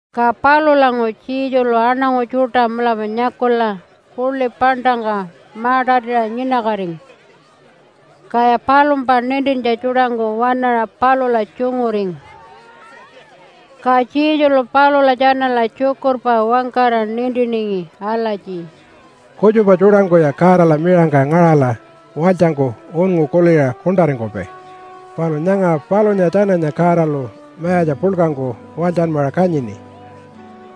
Ka palulanguṟu Jesulu aṉangu tjuṯa mulapa nyakula puḻi paṉṯangka ma-tatiṟa nyinakatingu, kaya palumpa nintintja tjuṯangku waṉaṟa palula tjunguringu. Ka Jesulu palula tjanala tjukurpa wangkara nintiningi alatji, “Kutjupa tjuṯangkuya Godala miṟangka ngaṟala walytjangku unngu kuliṟa kuṉṯaringkupai. Palu nyanga palunya tjananya Godalu mayatja puḻkangku walytjanmaṟa kanyini,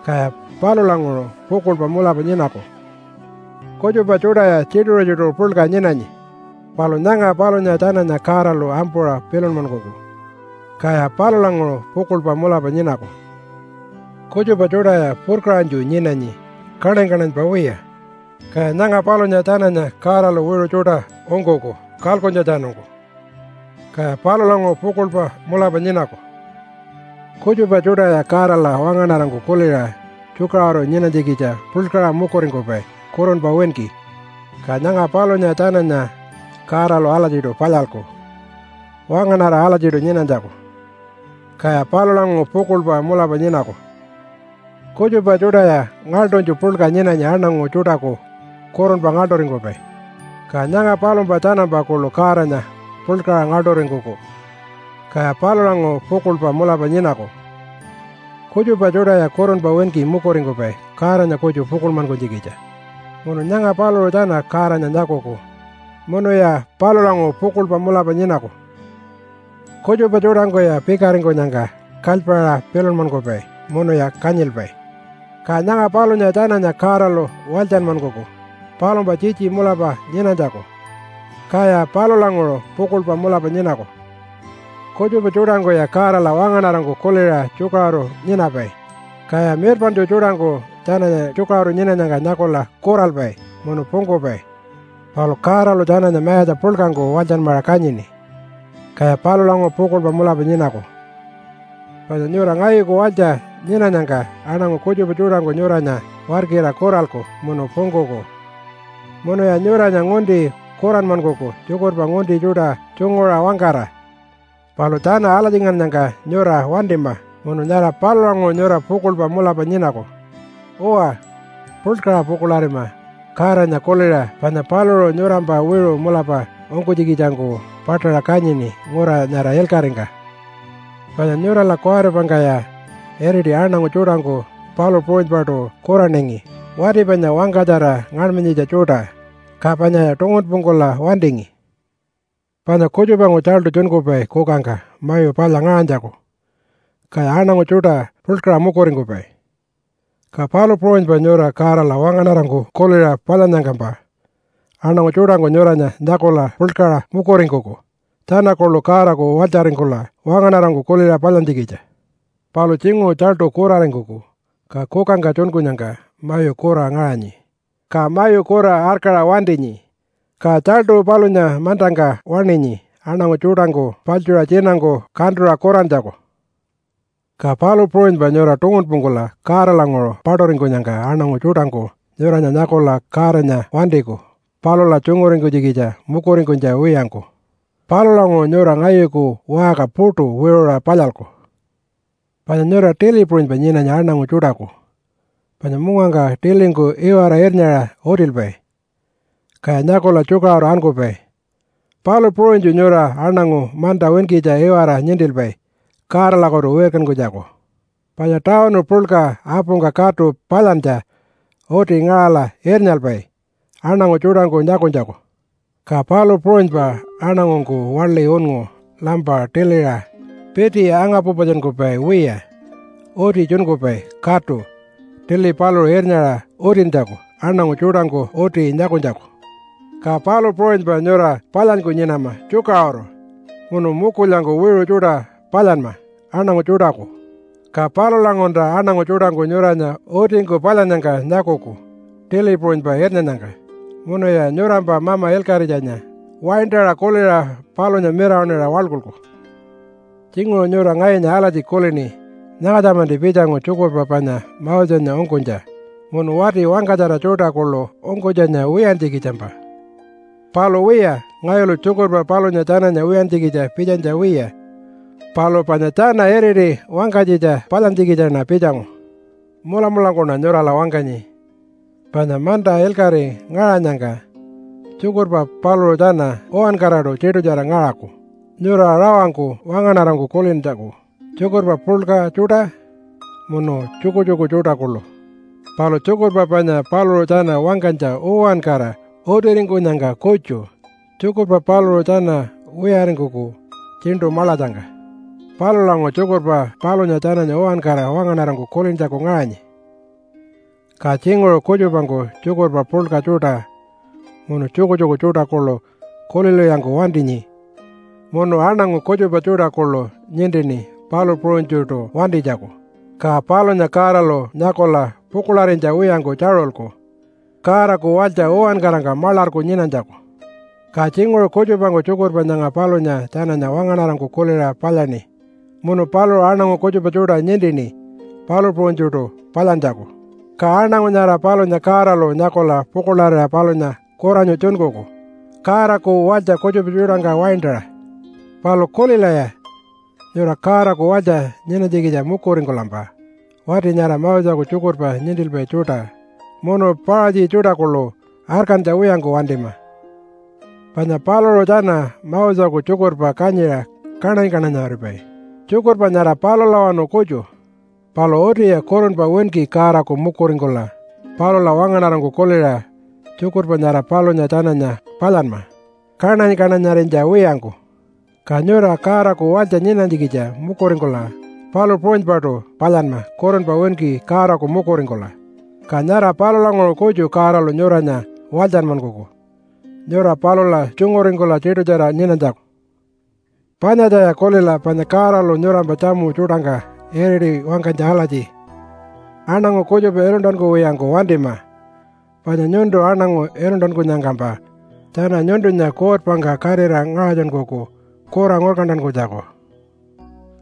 kaya palulanguṟu pukuḻpa mulapa nyinaku. Kutjupa tjuṯaya tjituṟu-tjituṟu puḻka nyinanyi. Palu nyanga palunya tjananya Godalu ampuṟa pilunmankuku, kaya palulanguṟu pukuḻpa mulapa nyinaku. Kutjupa tjuṯaya purkaṟanytju nyinanyi kaṉany-kaṉanypa wiya. Ka nyanga palunya tjananya Godalu wiṟu tjuṯa ungkuku kalkuntjatjanungku, kaya palulanguṟu pukuḻpa mulapa nyinaku. Kutjupa tjuṯaya Godala wangaṉarangku kuliṟa tjukaṟuru nyinanytjikitja puḻkaṟa mukuringkupai kurunpa winki. Ka nyanga palunya tjananya Godalu alatjiṯu palyalku wangaṉara alatjiṯu nyinanytjaku, kaya palulanguṟu pukuḻpa mulapa nyinaku. Kutjupa tjuṯaya ngaḻṯunytju puḻka nyinanyi aṉangu tjuṯaku kurunpa ngaḻṯuringkupai. Ka nyanga palumpa tjanampa kuḻu Godanya puḻkaṟa ngaḻṯuringkuku, kaya palulanguṟu pukuḻpa mulapa nyinaku. Kutjupa tjuṯaya kurunpa winki mukuringkupai Godanya kutju pukuḻmankunytjikitja. Munu nyanga paluṟu tjana Godanya nyakuku, munuya palulanguṟu pukuḻpa mulapa nyinaku. Kutjupa tjuṯangkuya pikaringkunyangka kalypaṟa pilunmankupai munuya kanyilpai. Ka nyanga palunya tjananya Godalu walytjanmankuku palumpa tjitji mulapa nyinanytjaku, kaya palulanguṟu pukuḻpa mulapa nyinaku. Kutjupa tjuṯangkuya Godala wangaṉarangku kuliṟa tjukaṟuru nyinapai, kaya mirpaṉtju tjuṯangku tjananya tjukaṟuru nyinanyangka nyakula kuralpai munu pungkupai. Palu Godalu tjananya mayatja puḻkangku walytjanmaṟa kanyini, kaya palulanguṟu pukuḻpa mulapa nyinaku. “Panya nyura ngayuku walytja nyinanyangka aṉangu kutjupa tjuṯangku nyuranya warkira kuralku munu pungkuku munuya nyuranya ngunti kuranmankuku tjukurpa ngunti tjuṯa tjunguṟa wangkara. Palu tjana alatjingannyangka nyura wantima munu nyara palulanguṟu nyura pukuḻpa mulapa nyinaku. Uwa, puḻkaṟa pukuḻarima Godanya kuliṟa panya paluṟu nyurampa wiṟu mulapa ungkunytjikitjangku paṯaṟa kanyini ngura nyara ilkaṟingka. Panya nyurala kuwaripangkaya iriti aṉangu tjuṯangku palu puṟunypaṯu kuraningi wati panya wangkatjara ngaṉmanyitja tjuṯa, ka panyaya tungunpungkula wantingi. “Panya kutjupangku tjaltu tjunkupai kukangka mayu palya ngaṟanytjaku, kaya aṉangu tjuṯa puḻkaṟa mukuringkupai. Ka palu puṟunypa nyura Godala wangaṉarangku kuliṟa palyannyangkampa aṉangu tjuṯangku nyuranya nyakula puḻkaṟa mukuringkuku tjana kuḻu Godaku walytjaringkula wangaṉarangku kuliṟa palyantjikitja. Palu tjinguṟu tjaltu kuraringkuku, ka kukangka tjunkunyangka mayu kura ngaṟanyi, ka mayu kura arkaṟa wantinyi. Ka tjaltu palunya mantangka waṉinyi aṉangu tjuṯangku paḻtjuṟa tjinangku kantuṟa kurantjaku. Ka palu puṟunypa nyura tungunpungkula Godalanguṟu paṯuringkunyangka aṉangu tjuṯangku nyuranya nyakula Godanya wantiku palula tjunguringkunytjikitja mukuringkunytja wiyangku. Palulanguṟu nyura ngayuku waṟka puṯu wiṟuṟa palyalku. “Panya nyura tili puṟunypa nyinanyi aṉangu tjuṯaku. Panya mungangka tilingku iwara irnyaṟa utilpai, kaya nyakula tjukaṟuru ankupai, palu puṟunytju nyura aṉangu manta winkitja iwara nintilpai Godalakutu wirkankunytjaku. Panya tawunu puḻka apungka katu palyantja uti ngaṟala irnyalpai aṉangu tjuṯangku nyakunytjaku. Ka palu puṟunypa aṉangungku waḻi unngu lampa tiliṟa piti anga-pupatjunkupai wiya uti tjunkupai katu tili paluṟu irnyaṟa utintjaku aṉangu tjuṯangku uti nyakunytjaku. Ka palu puṟunypa nyura palyanyku nyinama tjukaṟuru munu mukulyangku wiṟu tjuṯa palyanma aṉangu tjuṯaku, ka palulanguṟulta aṉangu tjuṯangku nyuranya utingku palyannyangka nyakuku tili puṟunypa irnyannyangka, munuya nyurampa Mama Ilkaṟitjanya waintaṟa kuliṟa palunya mirawaṉira waḻkulku. “Tjinguṟu nyura ngayunya alatji kulini, ‘Nyangatja-manti pitjangu tjukurpa panya Mosenya ungkunytja munu wati wangkatjara tjuṯa kuḻu ungkunytjanya wiyantjikitjampa.’ Palu wiya, ngayulu tjukurpa palunya tjananya wiyantjikitja pitjanytja wiya, palu panya tjana iriti wangkanytjitja palyantjikitjaṉa pitjangu. Mulamulangkuṉa nyurala wangkanyi, panya manta ilkaṟi ngaṟanyangka, tjukurpa paluṟu tjana uwankaraṯu tiṯutjara ngaṟaku, nyura rawangku wangaṉarangku kulintjaku, tjukurpa puḻka tjuṯa, munu tjukutjuku tjuṯa kuḻu. Palu tjukurpa panya paluṟu tjana wangkanytja uwankara utiringkunyangka kutju, tjukurpa paluṟu tjana wiyaringkuku tjiṉṯu maḻatjangka. Palulanguṟu tjukurpa palunya tjananya uwankara wangaṉarangku kulintjaku ngaṟanyi, ka tjinguṟu kutjupangku tjukurpa puḻka tjuṯa, munu tjukutjuku tjuṯa kuḻu kulilwiyangku wantinyi, munu aṉangu kutjupa tjuṯa kuḻu nintini palu puṟunytjuṯu wantinytjaku, ka palunya Godalu nyakula pukuḻarinytja wiyangku tjaṟulku, Godaku walytja uwankarangka maḻarku nyinanytjaku. Ka tjinguṟu kutjupangku tjukurpa nyanga palunya tjananya wangaṉarangku kuliṟa palyaṉi munu paluṟu aṉangu kutjupa tjuṯa nintini palu puṟunytjuṯu palyantjaku, ka aṉangu nyara palunya Godalu nyakula pukuḻarira palunya kuranyu tjunkuku Godaku walytja kutjupa tjuṯangka waintaṟa. Palu kulilaya! Nyura Godaku walytja nyinanytjikitja mukuringkulampa, wati nyara Moseku tjukurpa nintilpai tjuṯa, munu Paṟatji tjuṯa kuḻu arkantja wiyangku wantima. Panya paluṟu tjana Moseku tjukurpa kanyiṟa kaṉany-kaṉanyaripai, tjukurpa nyara palulawanu kutju. Palu utiya kurunpa winki Godaku mukuringkula, palula wangaṉarangku kuliṟa, tjukurpa nyara palunya tjananya palyanma, kaṉany-kaṉanyarinytja wiyangku. Ka nyura Godaku walytja nyinanytjikitja mukuringkula palu puṟunypaṯu palyanma kurunpa winki Godaku mukuringkula ka nyara palulanguṟu kutju Godalu nyuranya walytjanmankuku nyura palula tjunguringkula tiṯutjara nyinanytjaku. “Panyatjaya kulila, panya Godalu nyurampa tjamu tjuṯangka iriṯi wangkanytja alatji, ‘Aṉangu kutjupa iluntankuwiyangku wantima, panya nyuntu aṉangu iluntankunyangkampa tjana nyuntunya kuutpangka katira ngaṟatjunkuku kura ngurkantankunytjaku.’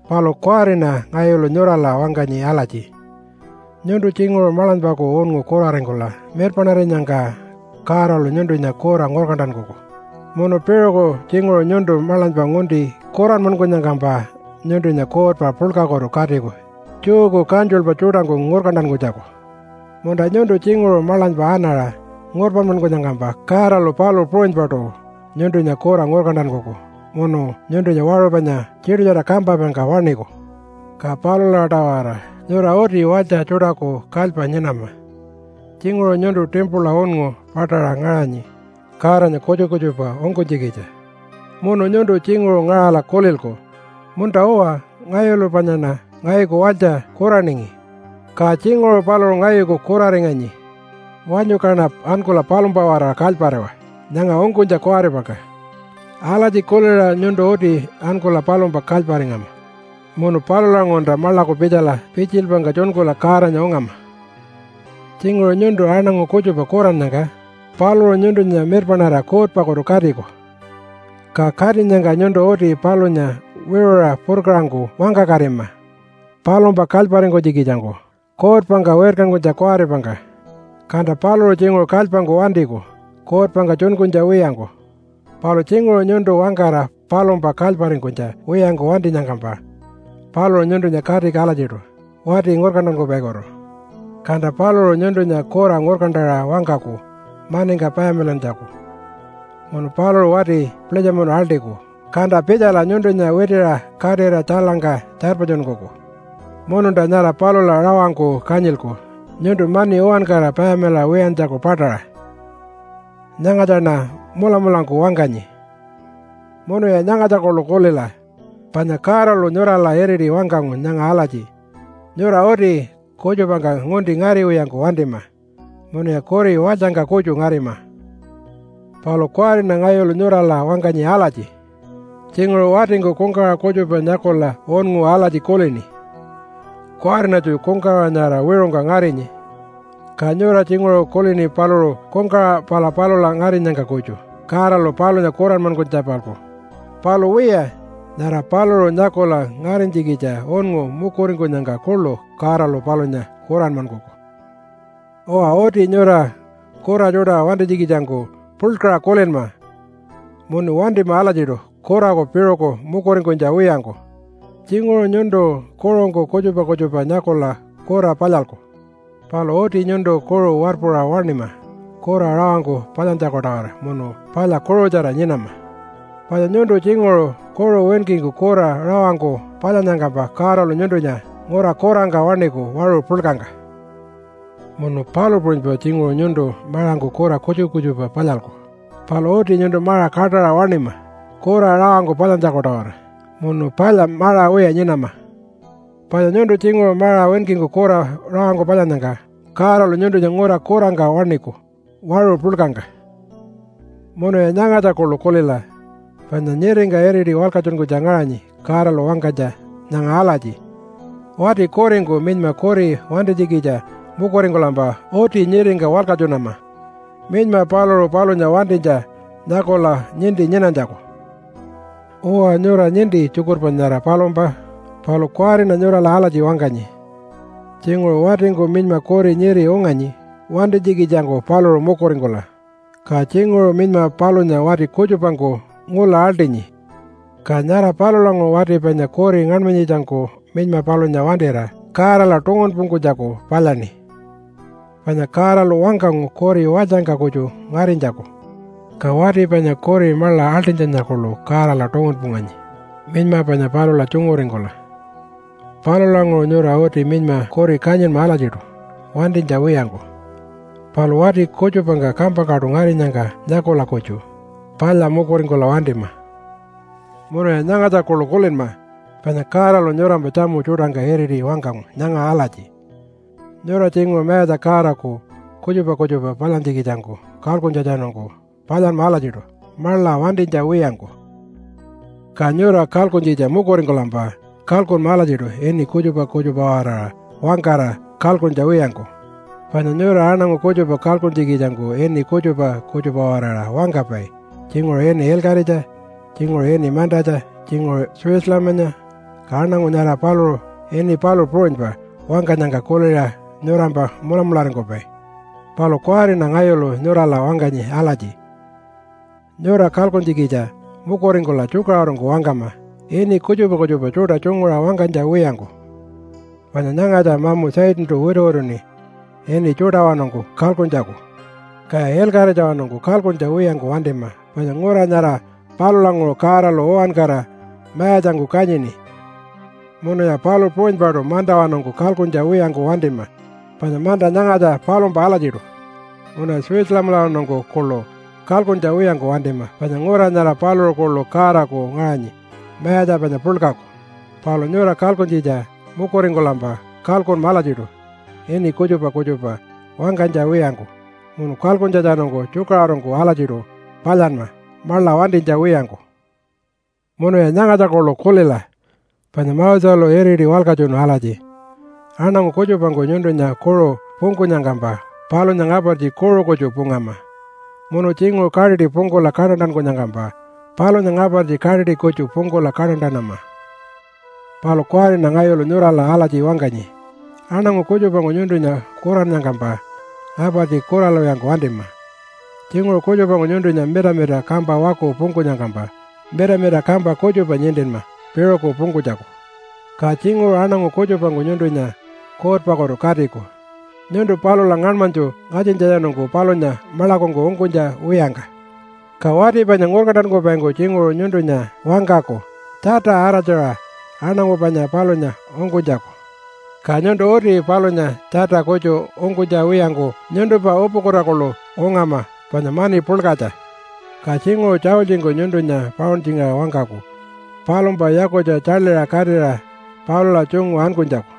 Palu kuwariṉa ngayulu nyurala wangkanyi alatji, nyuntu tjinguṟu maḻanypaku unngu kuraringkula mirpaṉarinyangka Godalu nyuntunya kura ngurkantankuku. Munu piṟuku tjinguṟu nyuntu maḻanypa ngunti kuranmankunyangkampa nyuntunya kuutpa puḻkakutu katiku Jewku kantjulpa tjuṯangku ngurkantankunytjaku. Munta nyuntu tjinguṟu maḻanypa anaṟa ngurpanmankunyangkampa Godalu palu puṟunypaṯu nyuntunya kura ngurkantankuku munu nyuntunya waṟu panya tiṯutjara kampapaingka waṉiku. Ka palula-tawara nyura uti walytja tjuṯaku kalypa nyinama. Tjinguṟu nyuntu timpula unngu paṯaṟa ngaṟanyi Godanya kutjupa kutjupa ungkunytjikitja munu nyuntu tjinguṟu ngaṟala kulilku, ‘Munta-uwa! Ngayulu panyaṉa ngayuku walytja kuraningi, ka tjinguṟu paluṟu ngayuku kuraringanyi. Wanyu kaṉa ankula palumpa-waraṟa kalypariwa nyanga ungkunytja kuwaripangka.’ Alatji kuliṟa nyuntu uti ankula palumpa kalyparingama munu palulanguṟulta maḻaku pitjala pitjilpangka tjunkula Godanya ungama. “Tjinguṟu nyuntu aṉangu kutjupa kurannyangka paluṟu nyuntunya mirpaṉarira kuutpakutu katiku. Ka katinyangka nyuntu uti palunya wiṟuṟa purkaṟangku wangkakatima palumpa kalyparingkunytjikitjangku kuutpangka wirkankunytja kuwaripangka, kanta paluṟu tjinguṟu kalypangku wantiku kuutpangka tjunkunytja wiyangku. Palu tjinguṟu nyuntu wangkara palumpa kalyparingkunytja wiyangku wantinyangkampa paluṟu nyuntunya katiku alatjiṯu wati ngurkantankupaikutu, kanta paluṟu nyuntunya kura ngurkantaṟa wangkaku maningka payamilantjaku munu paluṟu wati pulitjamunu aḻṯiku kanta pitjala nyuntunya witiṟa katira tjailangka tjarpatjunkuku. Mununta nyara palula rawangku kanyilku nyuntu mani uwankara payamilaṟa wiyantjaku paṯaṟa. Nyangatjaṉa mulamulangku wangkanyi. “Munuya nyangatja kuḻu kulila, panya Godalu nyurala iriti wangkangu nyanga alatji, ‘Nyura uti kutjupangka ngunti ngariwiyangku wantima munuya kuri walytjangka kutju ngarima.’ Palu kuwariṉa ngayulu nyurala wangkanyi alatji, tjinguṟu watingku kungkawaṟa kutjupa nyakula unngu alatji kulini, ‘Kuwariṉatju kungkawaṟa nyara wiṟungka ngarinyi.’ Ka nyura tjinguṟu kulini paluṟu kungkawaṟa pala palula ngarinyangka kutju Godalu palunya kuranmankunytja-palku. Palu wiya, nyara paluṟu nyakula ngarinytjikitja unngu mukuringkunyangka kuḻu Godalu palunya kuranmankuku. “Uwa, uti nyura kura tjuṯa wantinytjikitjangku puḻkaṟa kulinma munu wantima alatjiṯu kuraku piṟuku mukuringkunytja wiyangku. Tjinguṟu nyuntu kuṟungku kutjupa kutjupa nyakula kura palyalku. Palu uti nyuntu kuṟu warpuṟa waṉima kura rawangku palyantjaku-tawara munu palya kuṟutjara nyinama, panya nyuntu tjinguṟu kuṟu winkingku kura rawangku palyannyangkampa Godalu nyuntunya ngura kurangka waṉiku waṟu puḻkangka. “Munu palu puṟunypa tjinguṟu nyuntu maṟangku kura kutjupa kutjupa palyalku. Palu uti nyuntu maṟa kaṯaṟa waṉima kura rawangku palyantjaku-tawara, munu palya maṟa wiya nyinama, panya nyuntu tjinguṟu maṟa winkingku kura rawangku palyannyangka Godalu nyuntunya ngura kurangka waṉiku waṟu puḻkangka. “Munuya nyangatja kuḻu kulila, panya nyiringka iriti walkatjunkunytja ngaṟanyi Godalu wangkanytja nyanga alatji, ‘Wati kuringku minyma kuri wantinytjikitja mukuringkulampa uti nyiringka walkatjunama minyma paluṟu palunya wantinytja nyakula ninti nyinanytjaku.’ Uwa, nyura ninti tjukurpa nyara palumpa, palu kuwariṉa nyurala alatji wangkanyi tjinguṟu watingku minyma kuri nyiri unganyi wantinytjikitjangku paluṟu mukuringkula, ka tjinguṟu minyma palunya wati kutjupangku ngula aḻṯinyi, ka nyara palulanguṟu wati panya kuri ngaṉmanyitjangku minyma palunya wantira Godala tungunpungkunytjaku palyaṉi, panya Godalu wangkangu kuri walytjangka kutju ngarinytjaku. Ka wati panya kuri maḻa aḻṯinytjanya kuḻu Godala tungunpunganyi minyma panya palula tjunguringkula. Palulanguṟu nyura uti minyma kuri kanyinma alatjiṯu wantinytja wiyangku, palu wati kutjupangka kampangkaṯu ngarinyangka nyakula kutju palya mukuringkula wantima. “Munuya nyangatja kuḻu kulinma, panya Godalu nyurampa tjamu tjuṯangka iriti wangkangu nyanga alatji, ‘Nyura tjinguṟu Mayatja Godaku kutjupa kutjupa palyantjikitjangku kalkuntjatjanungku palyanma alatjiṯu maḻa wantinytja wiyangku.’ Ka nyura kalkuntjikitja mukuringkulampa kalkunma alatjiṯu ini kutjupa kutjupa-waraṟa wangkara kalkuntja wiyangku. Panya nyura aṉangu kutjupa kalkuntjikitjangku ini kutjupa kutjupa-waraṟa wangkapai tjinguṟu ini ilkaṟitja, tjinguṟu ini mantatja, tjinguṟu Jerusalemanya, ka aṉangu nyara paluṟu ini palu puṟunypa wangkanyangka kuliṟa nyurampa mulamularingkupai. Palu kuwariṉa ngayulu nyurala wangkanyi alatji, nyura kalkuntjikitja mukuringkula tjukaṟurungku wangkama ini kutjupa kutjupa tjuṯa tjunguṟa wangkanytja wiyangku. Panya nyangatja mamu Satantu wituwituṉi ini tjuṯawanungku kalkuntjaku. Kaya ilkaṟitjawanungku kalkuntja wiyangku wantima panya ngura nyara palulanguṟu Godalu uwankara mayatjangku kanyini. Munuya palu puṟunypaṯu mantawanungku kalkuntja wiyangku wantima panya manta nyangatja palumpa alatjiṯu. Munuya Jerusalemalawanungku kuḻu kalkuntja wiyangku wantima panya ngura nyara paluṟu kuḻu Godaku ngaṟanyi mayatja panya puḻkaku. Palu nyura kalkuntjikitja mukuringkulampa kalkunma alatjiṯu ini kutjupa kutjupa wangkanytja wiyangku, munu kalkuntjatjanungku tjukaṟurungku alatjiṯu palyanma maḻa wantinytja wiyangku. “Munuya nyangatja kuḻu kulila! Panya Moselu iriti walkatjunu alatji, ‘Aṉangu kutjupangku nyuntunya kuṟu pungkunyangkampa palunya ngapartji kuṟu kutju pungama, munu tjinguṟu kaṯiṯi pungkula kaṯantankunyangkampa palunya ngapartji kaṯiṯi kutju pungkula kaṯantanama.’ Palu kuwariṉa ngayulu nyurala alatji wangkanyi, aṉangu kutjupangku nyuntunya kurannyangkampa ngapartji kuralwiyangku wantima. Tjinguṟu kutjupangku nyuntunya mitamita kampa waku pungkunyangkampa mitamita kampa kutjupa nintinma piṟuku pungkunytjaku. Ka tjinguṟu aṉangu kutjupangku nyuntunya kuutpakutu katiku nyuntu palula ngaṉmanytju ngatjintjatjanungku palunya maḻakungku ungkunytja wiyangka. Ka wati panya ngurkantankupaingku tjinguṟu nyuntunya wangkaku tjata araltjaṟa aṉangu panya palunya ungkunytjaku, ka nyuntu uti palunya tjata kutju ungkunytja wiyangku nyuntumpa upukuta kuḻu ungama panya mani puḻkatja. Ka tjinguṟu tjaultjingku nyuntunya pauntjingaṟa wangkaku palumpa yakutja tjaḻiṟa katira palula tjungu ankunytjaku.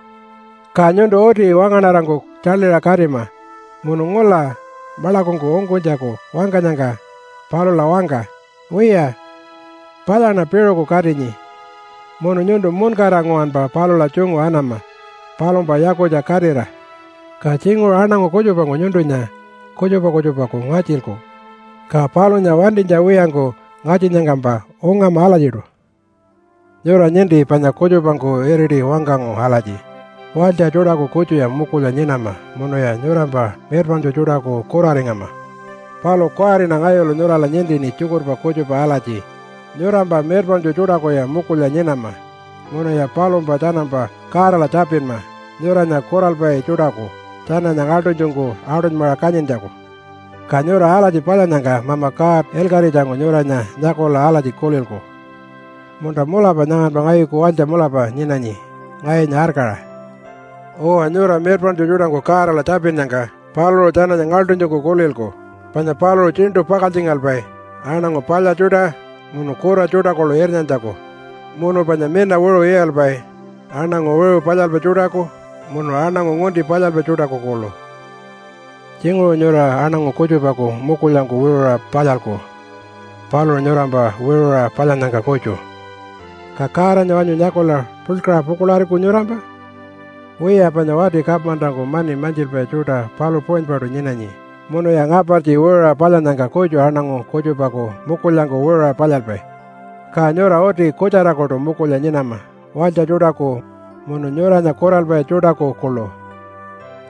Ka nyuntu uti wangaṉarangku tjaḻiṟa katima munu ngula maḻakungku ungkunytjaku wangkanyangka palula wangka, ‘Wiya, palyaṉa piṟuku katinyi.’ Munu nyuntu muṉkara nguwanpa palula tjungu anama palumpa yakutja katira. Ka tjinguṟu aṉangu kutjupangku nyuntunya kutjupa kutjupaku ngatjilku, ka palunya wantinytja wiyangku ngatjinnyangkampa ungama alatjiṯu. “Nyura ninti panya kutjupangku iriti wangkangu alatji, ‘Walytja tjuṯaku kutjuya mukulya nyinama munuya nyurampa mirpaṉtju tjuṯaku kuraringama.’ Palu kuwariṉa ngayulu nyurala nintini tjukurpa kutjupa alatji, ‘Nyurampa mirpaṉtju tjuṯakuya mukulya nyinama, munuya palumpa tjanampa Godala tjapinma nyuranya kuralpai tjuṯaku tjananya ngaḻṯunytjungku aṯunymaṟa kanyintjaku.’ Ka nyura alatji palyannyangka Mama God ilkaṟitjangku nyuranya nyakula alatji kulilku, ‘Munta mulapa nyanganpa ngayuku walytja mulapa nyinanyi ngayunya arkaṟa.’ Uwa, nyura mirpaṉtju tjuṯaku Godala tjapinnyangka paluṟu tjananya ngaḻṯunytjungku kulilku, panya paluṟu tjiṉṯu pakaltjingalpai aṉangu palya tjuṯa munu kura tjuṯa kuḻu irnyantjaku. Munu panya mina wiṟu iyalpai aṉangu wiṟu palyalpai tjuṯaku munu aṉangu ngunti palyalpai tjuṯaku kuḻu. Tjinguṟu nyura aṉangu kutjupaku mukulyangku wiṟuṟa palyalku paluṟu nyurampa wiṟuṟa palyannyangka kutju. Ka Godanya wanyu nyakula puḻkaṟa pukuḻariku nyurampa? Wiya, panya wati kamantaku mani mantjilpai tjuṯa palu puṟunypaṯu nyinanyi munuya ngapartji wiṟuṟa palyannyangka kutju aṉangu kutjupaku mukulyangku wiṟuṟa palyalpai. Ka nyura uti kutjarakuṯu mukulya nyinama walytja tjuṯaku munu nyuranya kuralpai tjuṯaku kuḻu.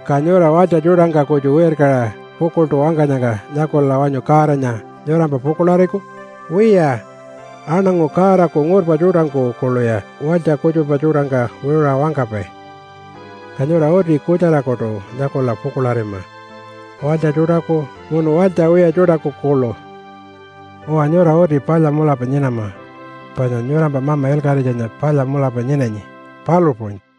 Ka nyura walytja tjuṯangka kutju wirkaṟa pukuḻṯu wangkanyangka nyakula wanyu Godanya nyurampa pukuḻariku? Wiya, aṉangu Godaku ngurpa tjuṯangku kuḻuya walytja kutjupa tjuṯangka wiṟuṟa wangkapai. Ka nyura uti kutjarakuṯu nyakula pukuḻarima walytja tjuṯaku munu walytja wiya tjuṯaku kuḻu. Uwa, nyura uti palya mulapa nyinama, panya nyurampa Mama Ilkaṟitjanya palya mulapa nyinanyi, palu puṟunypa.”